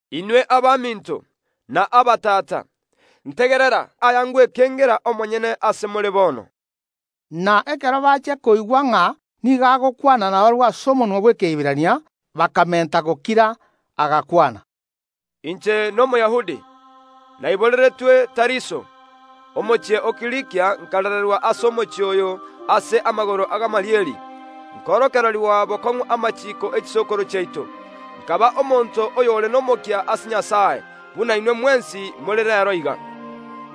“Inwe abaminto, na abatata, ntegerera aya ngwekengera omonyene ase more bono.” Na ekero bachia koigwa ng’a nigo agokwana nabarabwo ase omonwa bw’Ekeiberania, bakamenta gokira. Agakwana. “Inche n’Omoyahudi, naiboreretwe Tariso, omochie o Kilikia, nkarererwa ase omochie oyo ase amagoro a Gamalieli, nkorokererigwa bokong’u amachiiko ye chisokoro chiaito. Nkaba omonto oyore nomokia ase Nyasae, buna inwe mwensi more reero iga.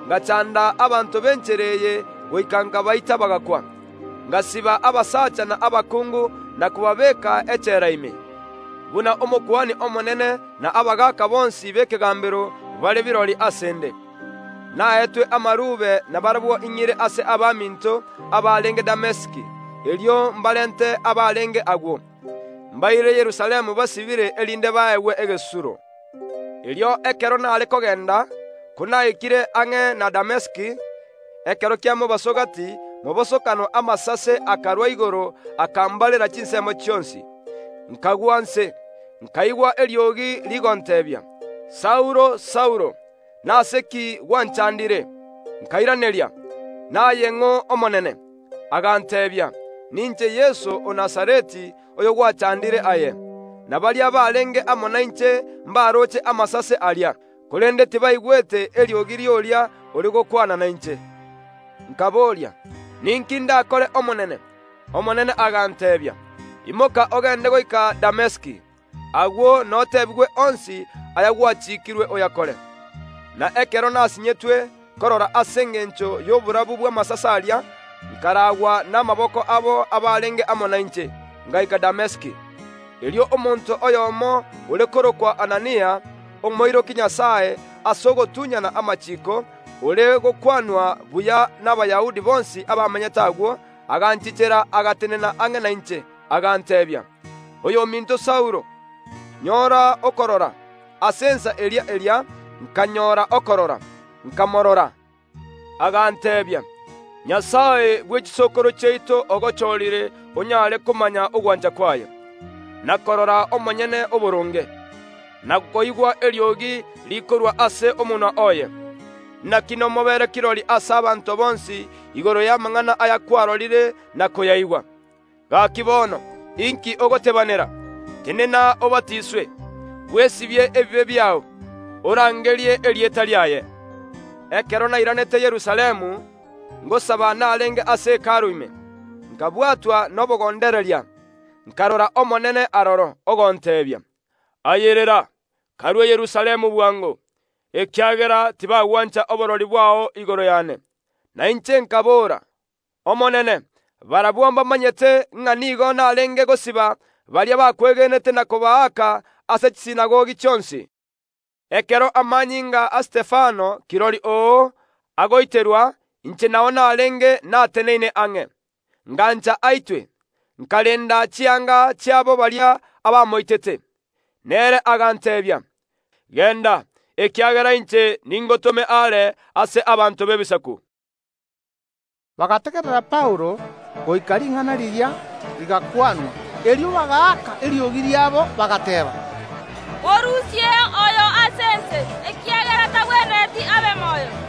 Ngachanda abanto b’Enchera eye goika nkabaita bagakwa, ngasiba abasacha na abakungu na kobabeeka echela ime, buna Omokuani omonene na abagaaka bonsi b’ekegambero bare kirori ase ’nde. Naetwe amarube nabarabwo ing’ire ase abaminto abarenge Damesiki, erio mbarente abarenge agwo, mbaire Yerusalemu basibire erinde baegwe egesusuro. “Erio ekero nare kogenda, konaikire ang’e na Damesiki, ekero kia mobaso gati mobosokano amasase akarwa igoro akambarera chinsemo chionsi. Nkagwa inse, nkaigwa eriogi rigonteebia: Saulo, Saulo, nase ki gwanchandire? Nkairaneria: Naye ng’Omonene? Aganteebia: Ninche Yeso o Nazareti oyogwachandire aye. Na baria barenge amo nainche mbaroche amasase aria, korende tibaigwete eriogi ri’oria ore gokwana nainche. Nkaboria: Ninki ndakore Omonene? Omonene aganteebia: Imoka ogende goika Damesiki, agwo noteebigwe onsi aya gwachiikirwe oyakore. Na ekero nasinyetwe korora ase engencho y’oborabu bw’amasase aria, nkaraagwa namaboko abo abarenge amo nainche, ngaika Damesiki. “Erio omonto oyomo ore korokwa Anania, omoiroki Nyasae ase ogotunyana amachiiko, ore gokwanwa buya n’Abayahudi bonsi abamenyete agwo, aganchichera agatenena ang’e nainche, aganteebia: Oyominto Saulo, nyora okorora. Ase ensa eria eria nkanyora okorora, nkamorora. Aganteebia: Nyasae bwe chisokoro chiaito ogochorire onyare komanya ogwancha kwaye, na korora Omonyene Oboronge, na koigwa eriogi rikorwa ase omonwa oye. Naki nomobeere kirori ase abanto bonsi igoro y’amang’ana aya kwarorire na koyaigwa. Gaki bono, inki ogotebanera? Tenena obatiswe, bwesibie ebibe biao, orangerie erieta riaye. “Ekero nairanete Yerusalemu, ngosaba narenge ase Hekalu ime, nkabwatwa nobogondereria, nkarora Omonene aroro, ogonteebia: Ayerera, karue Yerusalemu bwango, ekiagera tibagwancha oborori bwao igoro yane. Na inche nkaboora: Omonene, barabwo mbamanyete ng’a nigo narenge gosiba baria bakwegenete na kobaaka ase chisinagogi chionsi. Ekero amanyinga a Stefano, kirori oo, agoiterwa, inche nao narenge nateneine ang’e, ngancha aitwe, nkarenda chianga chiabo baria abamoitete. Nere aganteebia: Genda, ekiagera inche ningotome aare ase abanto b’Ebisaku.” Bagategerera Paulo goika ring’ana riria rigakwanwa. Erio bagaaka eriogi riabo, bagateeba: “Morusieo oyo ase ense, ekiagera tagwenereti abe moyo.”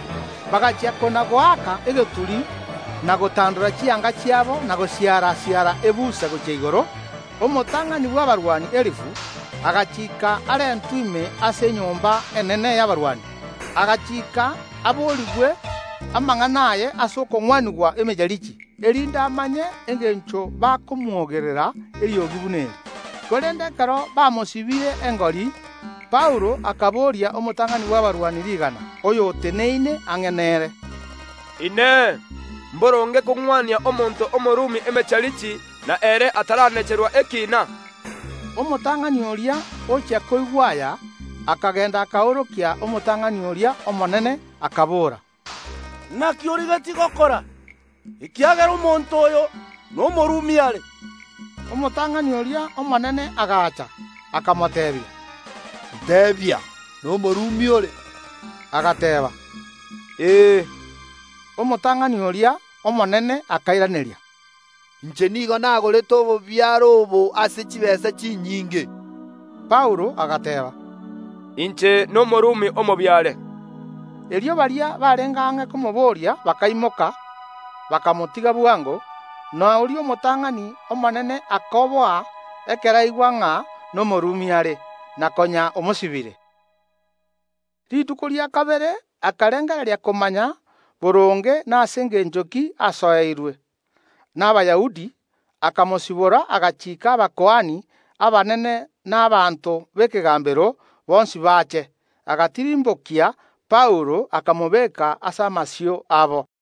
Bagachia kona‐goaka egeturi na gotandora chianga chiabo na gosiara‐siara ebuse gochia igoro. Omotang’ani bw’abarwani elifu agachiika arentwe ime ase enyomba enene y’abarwani, agachiika aborigwe amang’ana aye ase okong’wanigwa emecharichi, erinde amanye engencho bakomwogerera eriogi buna eri. Korende ekero bamosibire engori, Paulo akaboria omotang’ani bw’abarwani rigana, oyo oteneine ang’e nere: “Inee! Mboronge kong’wania omonto Omorumi emecharichi, na ere ataranacherwa ekiina?” Omotang’ani oria ochia koigwa aya, akagenda akoorokia omotang’ani oria omonene, akabora: “Naki origetie gokora? Ekiagera omonto oyo n’Omorumi are.” Omotang’ani oria omonene agacha, akamoteebia: “Nteebia, n’Omorumi ore?” Agateeba: “Ee.” Omotang’ani oria, omonene akairaneria: “Inche nigo nagorete obobiare obo ase chitaabu chinyinge.” Paulo agateeba: “Inche n’Omorumi omobiare.” Erio baria barenge ang’e komoboria bakaimoka, bakamotiga bwango, na oria omotang’ani omonene akoboa ekero aigwa ng’a n’Omorumi are, na konya omosibire. Rituko rikobwatia akarengereria komanya boronge nase engencho ki asoeirwe n’Abayahudi, akamosibora, agachiika abakuani abanene na abanto b’ekegambero bonsi bache. Agatirimbokia Paulo, akamobeka ase amasio abo.